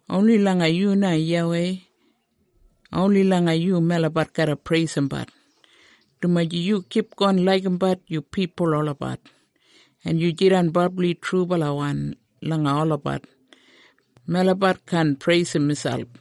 Oni langa yu na YAWEI, oni langa yu melabat garra preisimbat, dumaji yu kipgon laigimbat yu pipul olabat, en yu jidan brabli trubalawan langa olabat. Melabat kaan preisim miselp.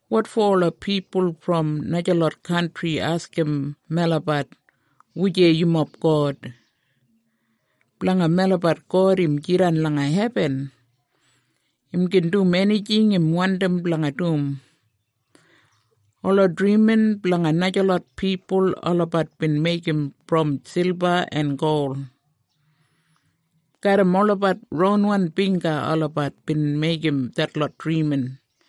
Wotfo ola pipul brom najalot kantri askim melabat, “Wujei yumob God?” Blanga melabat God im jidan langa hebin. Im gin dum enijing im wandim blanga dum. Ola drimin blanga najalot pipul, olabat bin meigim brom silba en gol. Garram olabat ronwan bingga olabat bin meigim detlot drimin.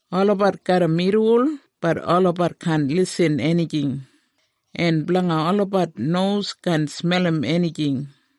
Olabat garram irriwol bat olabat kaan lisin enijing, en blanga olabat nos kaan smelim enijing.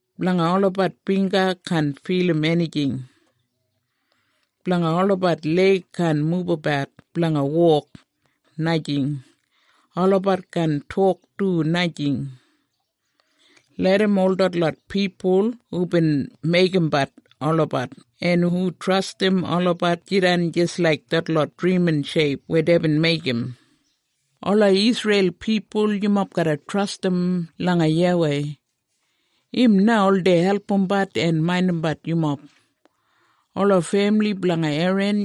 Blanga olabat bingga kaan filim enijing. Blanga olabat leig kaan mubabat blanga wok, najing. Olabat kaan tok du, najing. Larram ol detlot pipul hubin meigimbat olabat en hu trastim olabat jidan jis laik detlot drimin sheip weya deibin meigim. Ola Isreil pipul, yumob garra trastim langa YAWEI. Im na oldei albumbat en maindimbat yumob. Ola femili blanga Eran,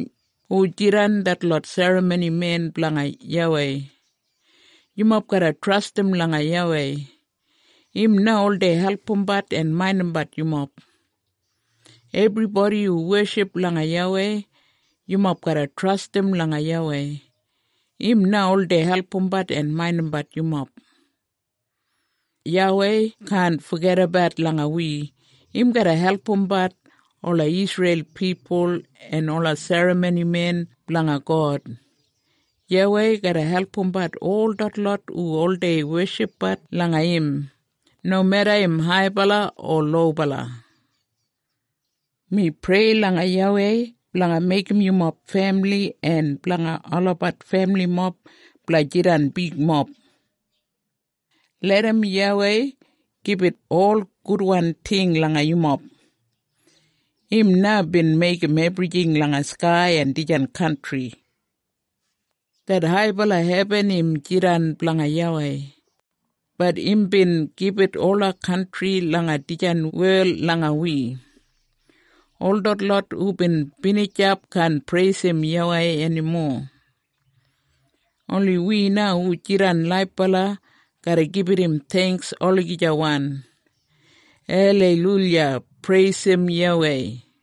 hu jidan detlot serramonimen blanga YAWEI, yumob garra trastim langa YAWEI. Im na oldei albumbat en maindimbat yumob. Ebribodi hu weship langa YAWEI, yumob garra trastim langa YAWEI. Im na oldei albumbat en maindimbat yumob. YAWEI kaan fogedabat langa wi. Im garra albumbat ola Isreil pipul, en ola serramonimen blanga God. YAWEI garra albumbat ol detlot hu oldei weshipbat langa im, nomeda im haibala o lobala. Mi prei langa YAWEI blanga meigim yumob femili en blanga olabat femilimob blanga jidan bigmob. Larram YAWEI gibit ol gudwan ting langa yumob. Im na bin meigim ebrijing langa skai en dijan kantri. Det haibala hebin im jidan blanga YAWEI, bat imbin gibit ola kantri langa dijan wel langa wi. Ol detlot hubin binijap kaan preisim YAWEI enimo. Oni wi na hu jidan laibala garra gibit im theingks olagijawan. Aleiluya! Preisim YAWEI!